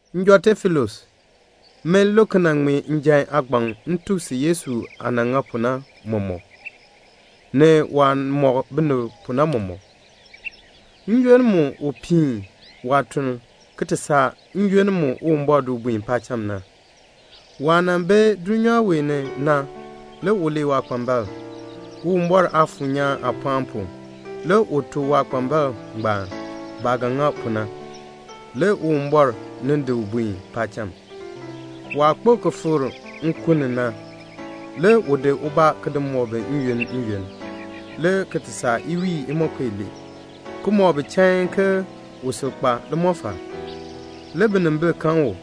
Njɔ Teofilus, min Luk nan ŋmee njan aagbaŋ m tuk si Yesu aah nan ŋa pu na mɔmɔk, ni waah mɔk binib pu na mɔmɔk, n-yoonn mu u nan piin waatuln ki ti saa n-yoonn mu Uwumbɔr di u buen paacham na. Waah nan bi dulnyaa wee ni na, le u lee waakpambalb. Uwumbɔr Aafuur nyaan aapɔɔn pu le u tuk waakpambalb ngbaan baah ga ŋa pu na, le Uwumbɔr nin di u buen paacham. Waah kpo ki fikr nkun ni na, le u di ubaa ki di mɔk bi n-yoonn n-yoonn, le ki ti saa iwiin imonko ilee, ki mɔk bi chain ke u sil kpa limɔfal. Le binimbil kan u.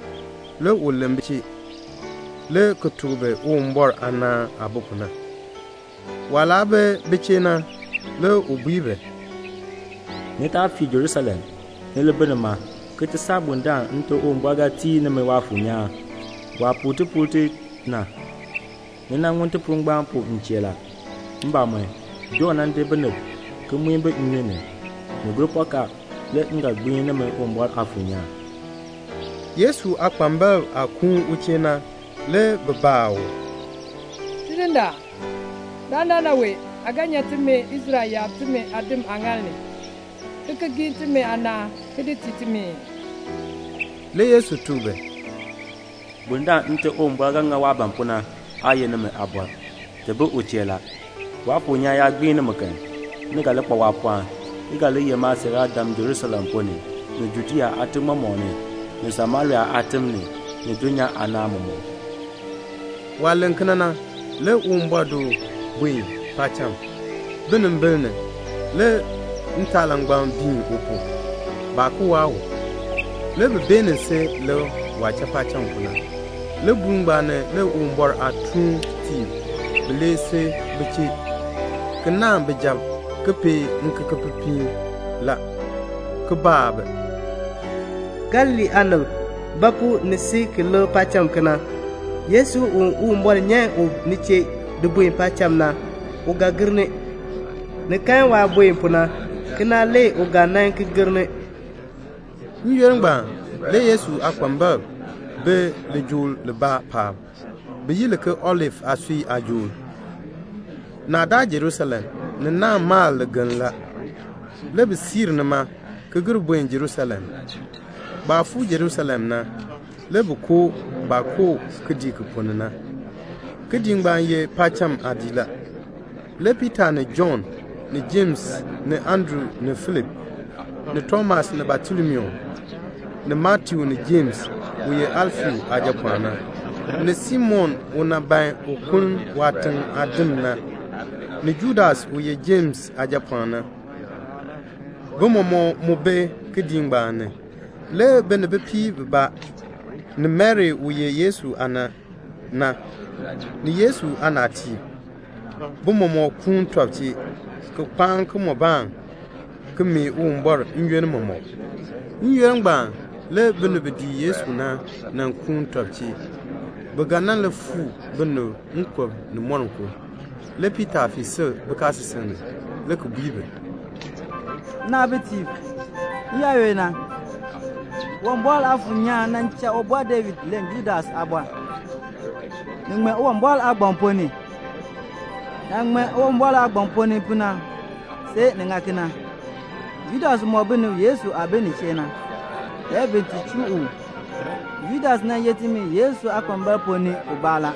Le u len bi chee, le ki tuk bi Uwumbɔr aanaan aah bi pu na. Waah laa bi bi chee na, le u bui bi, "Ni taa fii Jerusalem. Ni li bi nima, ki ti saa bundaln Nte Uwumbɔr ga tii nimi Waafuur nyaan, waah puu tipuul ti na. Ni nan ŋun tipuul ngbaan pu m chee la. Mbamɔn, Jɔnn nan di binib ki muin bi nnyun ni. Ni gur pɔkaa, le m ga gbiin nimi Uwumbɔr Aafuur nyaan." Yesu aakpambalb aah kuun u chee na, le bi baa u, "Tidindaan, dandana wee aa ga nyan timi Israel yaab timi aadim aaŋaal ni, ki ki giin timi aanaan, ki di tii timi ii?" Le Yesu tuk bi, "Bundaln Nte Uwumbɔr ga ŋa waah ban pu na, aa ye nimi aabɔr. Ti bi u chee la. Waafuur nyaan yaa gbiin nimi kan, ni ga li kpa waapɔɔn, ki ga li ye maasiiraadam Jerusalem ponn ni, ni Judea aatim mɔmɔk ni, ni Samaria aatim ni, ni dulnyaa aanaan mɔmɔk." Waah len kena na, le Uwumbɔr di u buen paacham, binimbil ni. Le ntaalangbam biin u pu. Baa ki waa u. Le bi beenin si lik waah cha paacham pu na. Libuul ngbaan ni, le Uwumbɔr aatuuntiib bilee si bi chee, ki naahn bijab, ki pee ŋikekepipiin la, ki baa bi, "Galilee aanib, ba pu ni si ki lik paacham kena? Yesu, u Uwumbɔr nyan u ni chee di buen paacham na, u ga gir ni. Ni kan waah buen pu na. Kena, le u ga nan ki gir ni." N-yoonn ngbaan, le Yesu aakpambalb bi lijool libaa paab, bi yi li ke Olif aasui aajool. Naa daa Jerusalem. Ni naahn mal ligeln la. Le bi siir nima, ki gir buen Jerusalem. Baah fuu Jerusalem na, le bi koo baah koo kidiik ki ponn ni na. Kidiik ngbaan ye paacham aadiik la. Le Piita, ni Jɔnn, ni Jems, ni Andru, ni Filip, ni Tomas, ni Batolomiu, ni Matiu, ni Jems u ye Alfeus aajapɔɔn na, ni Simon u nan ban un kuln waatiŋ aadim na, ni Judas u ye Jems aajapɔɔn na, bi mɔmɔk mu bi kidiik ngbaan ni. Le bi ni bipiib bibaa, ni Mari u ye Yesu aana na, ni Yesu aanaatiib, bi mɔmɔk kuun tɔb chee, ki kpaan kimɔbaan, ki mee Uwumbɔr n-yoonn mɔmɔk. N-yoonn ngbaan, le binib bi dii Yesu na nan kuun tɔb chee. Bi ga nan li fuu binib nkub ni moninko. Le Piita fii sil bikaasisik ni, le ki bui bi, "Nnaabitiib, n-yaayoonn na, Uwumbɔr Aafuur nyaan nan cha Ubɔr David len Judas aabɔr. Ni ŋmee Uwumbɔr aagbaŋ ponn ni. Naah ŋmee pu Uwumbɔr aagbaŋ ponn ni na, see ni ŋa kena. Judas mɔk binib Yesu aah bi nin chee na, le bin ti chuu u. Judas nan ye timi Yesu aakpambalb ponn ni ubaa la.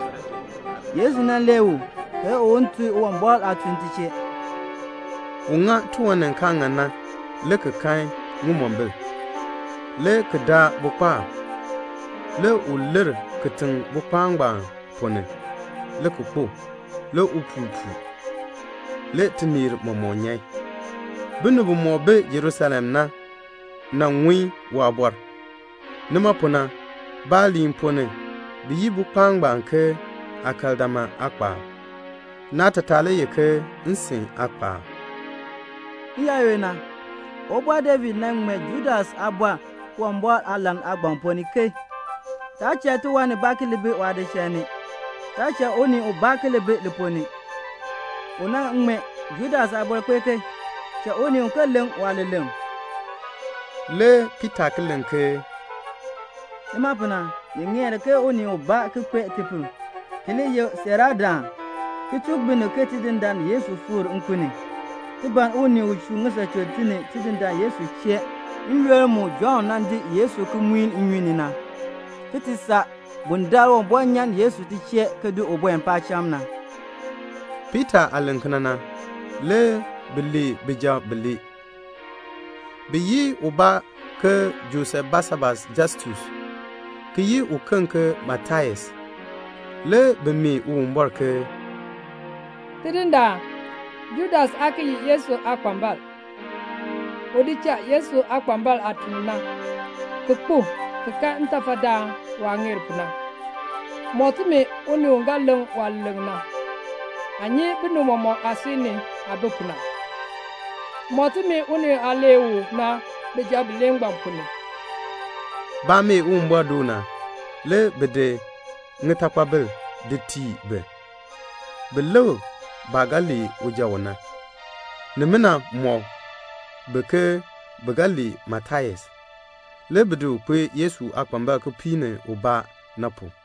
Yesu nan lee u, ke un ti tun Uwumbɔr aatuln ti chee." ( U ŋa tiwan ni kaa ŋan na, le ki kan ŋimombil, le ki daa bukpaab. Le u lir kitiŋ bukpaab ngbaan ponn ni, le ki kpo. Le upuul puu, le tineer mɔmɔk nyan. Binib bimɔk bi Jerusalem na ŋun waabɔr la. Nima pu na, baaliin ponn ni, bi yi bukpaab ngbaan ke Akeldama aakpaab. Naatataa le ye ke "Nsin aakpaab.") "N-yaayoonn na, Ubɔr David nan ŋmee Judas aabɔr Uwumbɔr aalahn aagbaŋ ponn ni ke 'Taa cha tiwan nibaa ki li bi waadichal ni. Taa cha unii ubaa ki li bi li ponn ni.' U nan ŋmee Judas aabɔr kpee ke; 'Cha unii uken leŋ waaleleŋ."' Le Piita ki len ke "Nima pu na, ni ŋeer ke unii ubaa ki kpee tibaa pu, u li ye siiraadaan, ki tuk binib ke Tidindaan Yesu fikr nkun ni. Ti ban unii u chuun ŋisachun ti ni Tidindaan Yesu chee, n-yoonn mu Jɔnn nan di Yesu ki muin u nnyun ni na, ki ti saa bundaln Uwumbɔr nyan Yesu ti chee ki di u buen paacham na." Piita aah len kena na, le bi lee bijab bilee. Bi yi ubaa ke Josef Basabas Justus ki yi uken ke Matias. Le bi mee Uwumbɔr ke "Tidindaan, Judas aa ki ye Yesu aakpambalb. U cha Yesu aakpambalb aatuln na, ki kpo ki kan ntafadaan waah ŋeer pu na. Mɔk timi unii u ga leŋ waaleleŋ na. Aa nyi binib mɔmɔk aasui ni aah bi pu na. Mɔk timi unii u aa lee u na bijab bilee ngbaan ponn ni." Baah mee Uwumbɔr doo na, le bi di ŋitakpabil di tii bi, bin lik baah ga lee uja u na. Nimina mɔk bi ke bi ga lee Matias. Le bi di u kpee Yesu aakpambalb kipiik ni ubaa na pu.